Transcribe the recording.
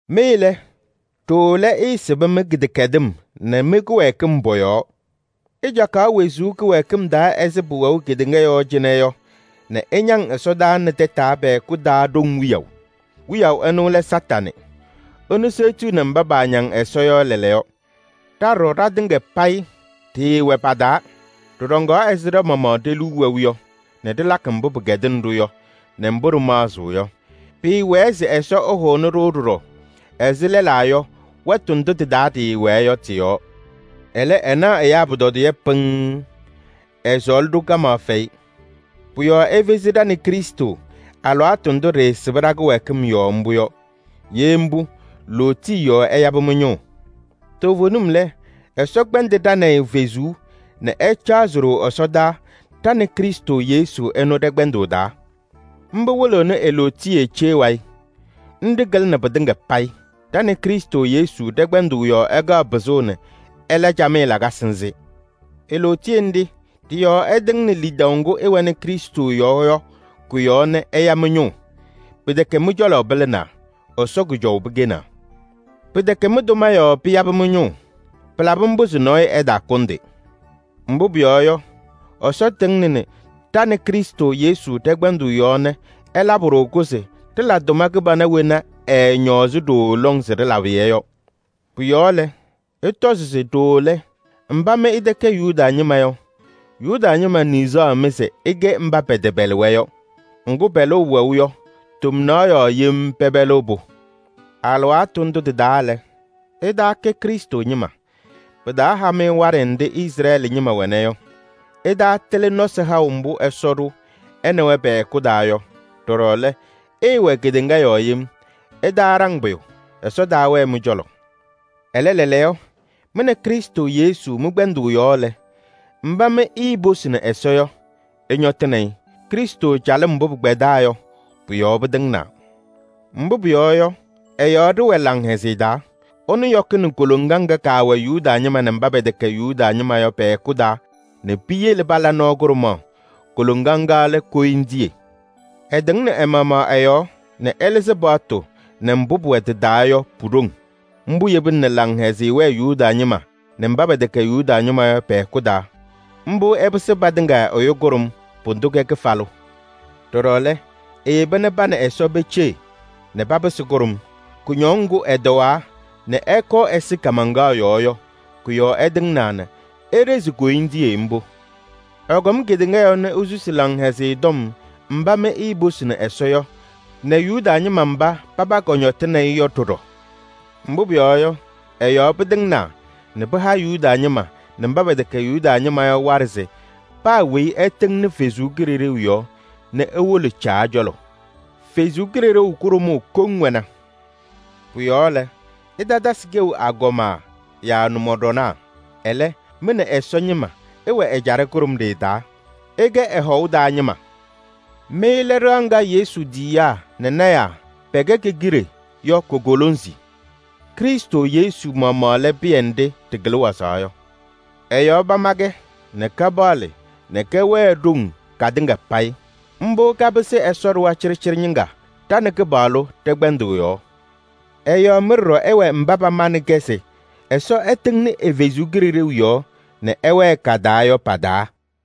Mɩ lɛ, ɖooo lɛ, ɩɩsɩbɩ mɩ-kɩdɛkɛdɩm nɛ mɩ-kɩwɛɛkɩm pɔ-yɔɔ. Ɩcaɣkaɣ wezuu ɛzɩ pʋwɛʋ kedeŋa yɔɔ cɩnɛ yɔ nɛ ɩñaŋ ɛsɔdaa ɖoŋ wiyaʋ. Ɛnʋ seɣtiɣni mba paañaŋ Ɛsɔ yɔ lɛɛlɛɛyɔ. Ɖa ɖɔɖɔ ɖatɩŋa payɩ ɖɩɩwɛ pa-taa. Ɖɩɖɔŋaɣ ɛzɩ ɖa-maɣmaɣ ɖe-liu wɛʋ yɔ nɛ ɖɩlakɩ mbʋ pɩkɛdɩnɩ-ɖʋ yɔ nɛ mbʋ ɖɩmaɣzɩɣ yɔ. Pɩɩwɛɛ se Ɛsɔ ɛhʋnɩ-ɖʋ ɖɔɖɔ ɛzɩ lɛlaa yɔ wɛtʋ ndʋ tɩ-taa ɖɩwɛɛ yɔ tɩ-yɔɔ. Ɛlɛ, ɛnaɣ ɛyaa pʋtɔdɩyɛ pɩŋŋ, ɛsɔɔlɩ-ɖʋ kamaɣ fɛyɩ. Pʋ-yɔɔ efezi ɖa nɛ Krɩstʋ alɩwaatʋ ndʋ ɖɩɩsɩbɩ ɖa-kɩwɛɛkɩm yɔɔ mbʋ yɔ. Ye mbʋ, lootiye yɔɔ ɛyabɩ mɩ-ñʋʋ. Toovenim lɛ Ɛsɔ kpɛndɩ ɖa nɛ ɩ fezuu nɛ ɛcaɣzɩ-ɖʋ ɛsɔdaa ɖa nɛ Krɩstʋ Yesu ɛnʋ ɖɛ-kpɛndʋʋ taa. Mbʋ wɩlɩɣnɩ e-lootiye cee wayɩ. Nɖɩ kɩlɩnɩ pɩtɩŋa payɩ. Ɖa nɛ Krɩstʋ Yesu ɖɛ-kpɛndʋʋ yɔɔ ɛkaɣ pɩzʋʋ nɛ ɛla camɩyɛ lakasɩ nzɩ. E-lootiye nɖɩ ɖɩ-yɔɔ ɛtɩŋnɩ lidaʋ ŋgʋ ɩwɛnɩ Krɩstʋ yɔɔ yɔ kʋ-yɔɔ nɛ ɛya mɩ-ñʋʋ. Pɩtɛkɛ mɩ-cɔlɔ pɩlɩnaa, Ɛsɔ kʋjɔʋ pɩkɛnaa. Pɩtɛkɛ mɩ-tʋma yɔɔ pɩyabɩ mɩ-ñʋʋ. Pɩlabɩ mbʋ se nɔɔyʋ ɛtaakʋndɩ. Mbʋ pʋyɔɔ yɔ, Ɛsɔ tɩŋnɩnɩ ɖa nɛ Krɩstʋ Yesu ɖɛ-kpɛndʋʋ yɔɔ nɛ ɛlabɩ-ɖʋ-kʋ se ɖɩla tʋma kɩbana wena ɛɛñɔɔzɩ ɖooo lɔŋ se ɖɩlabɩ-yɛ yɔ. Pʋ-yɔɔ lɛ, ɩtɔzɩ se: ɖooo lɛ, mba mɩ ɩtɛkɛ Yuda ñɩma yɔ, Yuda ñɩma niɣzaɣ-mɩ se ɩkɛ kɩtɛpɛlɩŋ. Ŋgʋ, pɛlʋʋ wɛʋ yɔ, tomnaɣ yɔɔ yem pɛpɛlɩɣ-pʋ. Alɩwaatʋ ndʋ tɩ-taa lɛ, ɩtaakɛ Krɩstʋ ñɩma. Pɩtaaha-mɩ waɖɛ nɖɩ Izrɛɛlɩ ñɩma wɛna yɔ. Ɩtaatɩlɩ nɔsɩ haʋ mbʋ Ɛsɔ ɖʋ ɛ nɛ wɛ pɛ-hɛkʋ taa yɔ. Ɖɔɖɔ lɛ, ɩɩwɛ kedeŋa yɔɔ yem: ɩtaaɖaŋ pʋyʋ, ɛfɛyɩ mɩ-cɔlɔ. Ɛlɛ, lɛɛlɛɛyɔ mɩ nɛ Krɩstʋ Yesu mɩ-kpɛndʋʋ yɔɔ lɛ, mba mɩ iiposini Ɛsɔ yɔ, ɩñɔtɩnɩ-ɩ. Krɩstʋ calɩm mbʋ pɩkpɛdaa yɔ, pʋ-yɔɔ pɩtɩŋnaa. Mbʋ pʋyɔɔ yɔ, ɛ-yɔɔ ɖɩwɛ laŋhɛzɩyɛ taa. Ɛnʋ yɔkɩnɩ koloŋa ŋga kaawɛ Yuda ñɩma nɛ mba pɛtɛkɛ Yuda ñɩma yɔ pɛ-hɛkʋ taa nɛ piyele pala nɔɔ kʋɖʋmaɣ. Koloŋa ŋga lɛ koyindiye. Ɛtɩŋnɩ ɛ-maɣmaɣ ɛ-yɔɔ nɛ ɛlɩzɩ paɣtʋ nɛ mbʋ pʋwɛ tɩ-taa yɔ pu-ɖoŋ. Mbʋ yebina nɛ laŋhɛzɩyɛ wɛɛ Yuda ñɩma nɛ mba pɛtɛkɛ Yuda ñɩma yɔ pɛ-hɛkʋ taa. Mbʋ ɛpɩsɩ patɩŋa ɛyʋ kʋɖʋm, pʋdʋ kɛ kɩfalʋ. Ɖɔɖɔ lɛ, eyeba nɛ pa nɛ Ɛsɔ peceɣ nɛ papɩsɩ kʋɖʋm. Kʋñɔŋ ŋgʋ ɛtɔwaa nɛ ɛkɔɔ ɛsɩ kaamaŋkaɣ yɔɔ yɔ, kʋ-yɔɔ ɛtɩŋnaa nɛ eɖezi koyindiye mbʋ. Ɛkɔm kedeŋa yɔɔ nɛ esusi Laŋhɛzɩyɛ Tɔm mba mɩ iiposini Ɛsɔ yɔ nɛ Yuda ñɩma mba paba kɔñɔtɩnɩ-ɩ yɔ ɖɔɖɔ. Mbʋ pʋyɔɔ yɔ, ɛ-yɔɔ pɩtɩŋnaa nɛ pɩha Yuda ñɩma nɛ mba pɛtɛkɛ Yuda ñɩma yɔ waɖɛ se paa weyi ɛtɩŋnɩ Ɛsɔ Kalɩzaɣ yɔɔ nɛ ewolo Caa cɔlɔ. Ɛsɔ Kalɩzaɣ kʋɖʋmaɣ kɔŋ wɛna. Pʋ-yɔɔ lɛ, ɩtatasɩ kɛʋ agɔma yaa nʋmɔɖɔnaa. Ɛlɛ, mɩ nɛ Ɛsɔ ñɩma ɩwɛ ɛjaɖɛ kʋɖʋmɖɩyɛ taa, ɩkɛ ɛ-hɔʋ taa ñɩma. Mɩ lɛ ɖɩɣa ŋga Yesu tiyiyaa nɛ lɔɔyɩsɩ tɩnaa pɛkɛ ke-kiɖe yɔ ko-kolonzi. Krɩstʋ Yesu maɣmaɣ lɛ pɩyɛ nɖɩ ɖɩkɩlɩ wazaɣ yɔ. Ɛ-yɔɔ pama-kɛ nɛ kapaɣlɩ nɛ kɛwɛɛ ɖoŋ katɩŋa payɩ. Mbʋ kapɩsɩɣ Ɛsɔ ɖɩɣa cɩɖɩcɩɖɩ ñɩŋga ɖa nɛ Kɩpaɣlʋ ɖɛ-kpɛndʋʋ yɔɔ. Ɛ-yɔɔ mɩ ɖɔɖɔ ɩwɛ mba pamanɩ-kɛ se Ɛsɔ ɛtɩŋnɩ ɛ-Kalɩzaɣ yɔɔ nɛ ɛwɛɛ ka-taa yɔ pa-taa.